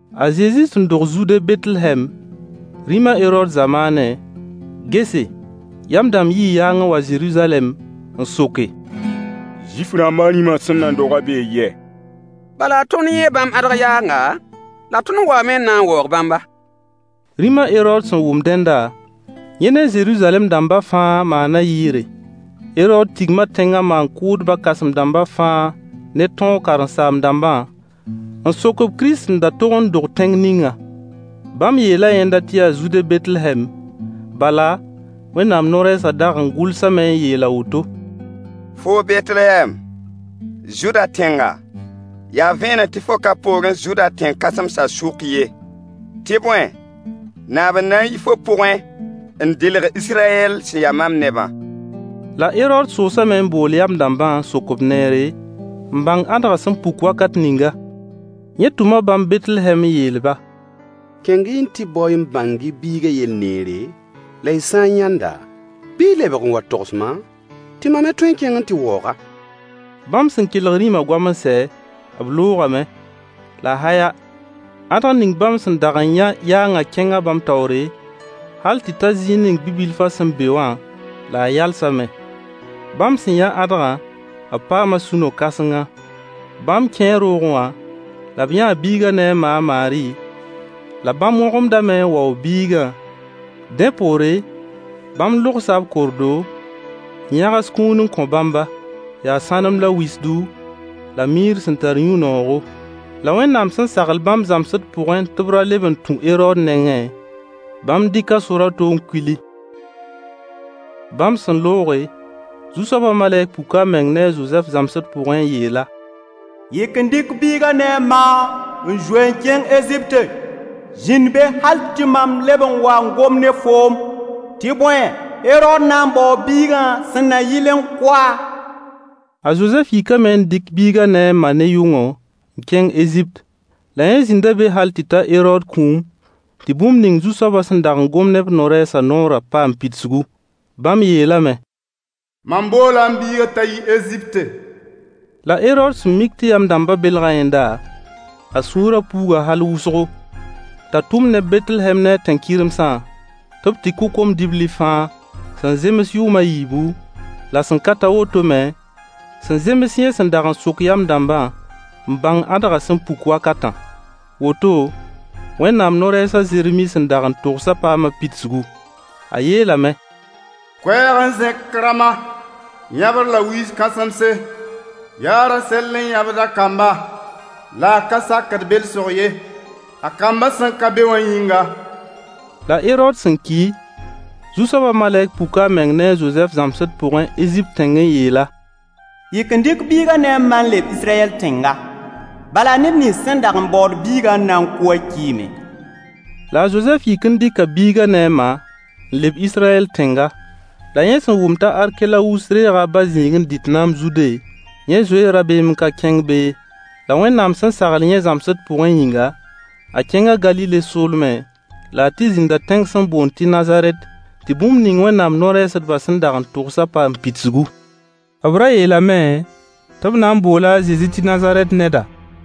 A Zezi sẽn dog Zude Betlehɛm, rĩm a Herood zamaanẽ, gese, yam dãmb yii yaang n wa Zeruzalɛm n soke: Zuif-rãmba rĩmã sẽn nan dogã bee yɛ? Bala tõnd yãa bãmb ãdg yaanga, la tõnd waame n na n waoog bãmba. Rĩm a Herood sẽn wʋm dẽnda, yẽ ne Zeruzalɛm dãmbã fãa maana yɩɩre. Herood tigma tẽngã maan-kʋʋdbã kãsem-dãmba fãa ne tõog karen-saam-dãmbã n sok-b Kirist sẽn da tog n dog tẽng ninga. Bãmb yeela yẽnda tɩ yaa Zude Betlehɛm, bala Wẽnnaam no-rɛɛsã dag n gʋlsame n yeel a woto: “Foo Betlehɛm, Zuda tẽnga, yaa vẽeneg tɩ fo ka poorẽ Zuda tẽn-kãsemsã sʋk ye. Tɩ bõe, naab n na n yi fo pʋgẽ n dɩlg Israyɛl sẽn ya mam nebã.” La Herood soosame n bool yam dãmbã n sok-b neere n bãng ãdgã sẽn puk wakat ninga. Yẽ tʋma bãmb Betlehɛm n yeel-ba: Kẽng-y n tɩ bao-y n bãng-y biigã yell neere, la y sã n yãnd-a, bɩ y lebg n wa n togs-ma, tɩ mam me tõe n kẽng n tɩ waoog-a. Bãmb sẽn kelg rĩmã goam n sɛ, b loogame. La haya, ãdg ning bãmb sẽn dag n yã yaangã kẽnga bãmb taoore, hal tɩ ta zĩig ning bi-bilfã sẽn be wã, la a yalsame. Bãmb sẽn yã ãdgã, b paama sũ-no-kãsenga. Bãmb kẽe roogẽ wã, la b yãa biigã ne a ma a Maari, la bãmb wõgemdame n waoog biigã. Dẽ poore, bãmb logsa b kordo, n yãgs kũun n kõ Bãmba: yaa sãnem la wisdu, la miir sẽn tar yũ-noogo. La Wẽnnaam sẽn sagl bãmb zãmsd pʋgẽ tɩ b ra leb n tũ Herood nengẽ, bãmb dɩka sor a to n kuili. Bãmb sẽn looge, Zu-soabã malɛk puka a meng ne a Zozɛf zãmsd pʋgẽ n yeel-a: Yik n dɩk biigã ne a ma n zoe n kẽng Ezipte. Zĩnd be hal tɩ mam leb n wa n gom ne foom. Tɩ bõe, Herood na n baoo biigã, sẽn na yɩl n kʋ-a. A Zozɛf yikame n dɩk biigã ne a ma ne yʋngo n kẽng Ezipt. La yẽ zĩnda be hal tɩ ta Herood kũum, tɩ bũmb ning Zu-soabã sẽn dag n gom ne b no-rɛɛsã noorã paam pidsgu. Bãmb yeelame: Mam boola m biigã t'a yi Ezipte. La Herood sẽn mik tɩ yam dãmbã belga yẽnda, a sũurã puuga hal wʋsgo, t'a tʋm neb Betlehɛm ne a tẽn-kɩremsã tɩ b tɩ kʋ kom-dibli fãa sẽn zems yʋʋm a yiibu la sẽn ka ta woto me, sẽn zems yẽ sẽn dag n sok yam dãmbã n bãng ãdgã sẽn puk wakatã. Woto, Wẽnnaam no-rɛɛs a Zeremi sẽn dag n togsã paama pidsgu. A yeelame: Koɛɛg n zẽk Rama, yãbr la wiis-kãsemse. Yaa a Rasɛll n yãbd a kamba, la a ka sakd belsg ye, a kambã sẽn ka be wã yĩnga. La Herood sẽn ki, Zu-soabã malɛk puka a meng ne a Zozɛf zãmsd pʋgẽ Ezipt tẽng n yeel-a: Yik n dɩk biigã ne a ma n leb Israyɛl tẽnga, bala neb nins sẽn dag n baood biigã n na n kʋ wã kiime. La a Zozɛf yik n dɩka biigã ne a ma n leb Israyɛl tẽnga. La yẽ sẽn wʋm t'a Arkelawus reega a ba zĩig n dɩt naam Zude, yẽ zoee rabeem n ka kẽng be ye. La Wẽnnaam sẽn sagl yẽ zãmsd pʋgẽ yĩnga, a kẽnga Galile soolmẽ, la a tɩ zĩnda tẽng sẽn boond tɩ Nazarɛt tɩ bũmb ning Wẽnnaam no-rɛɛsdbã sẽn dag n togsã paam pidsgu. B ra yeelame tɩ b na n boola a Zezi tɩ Nazarɛt neda.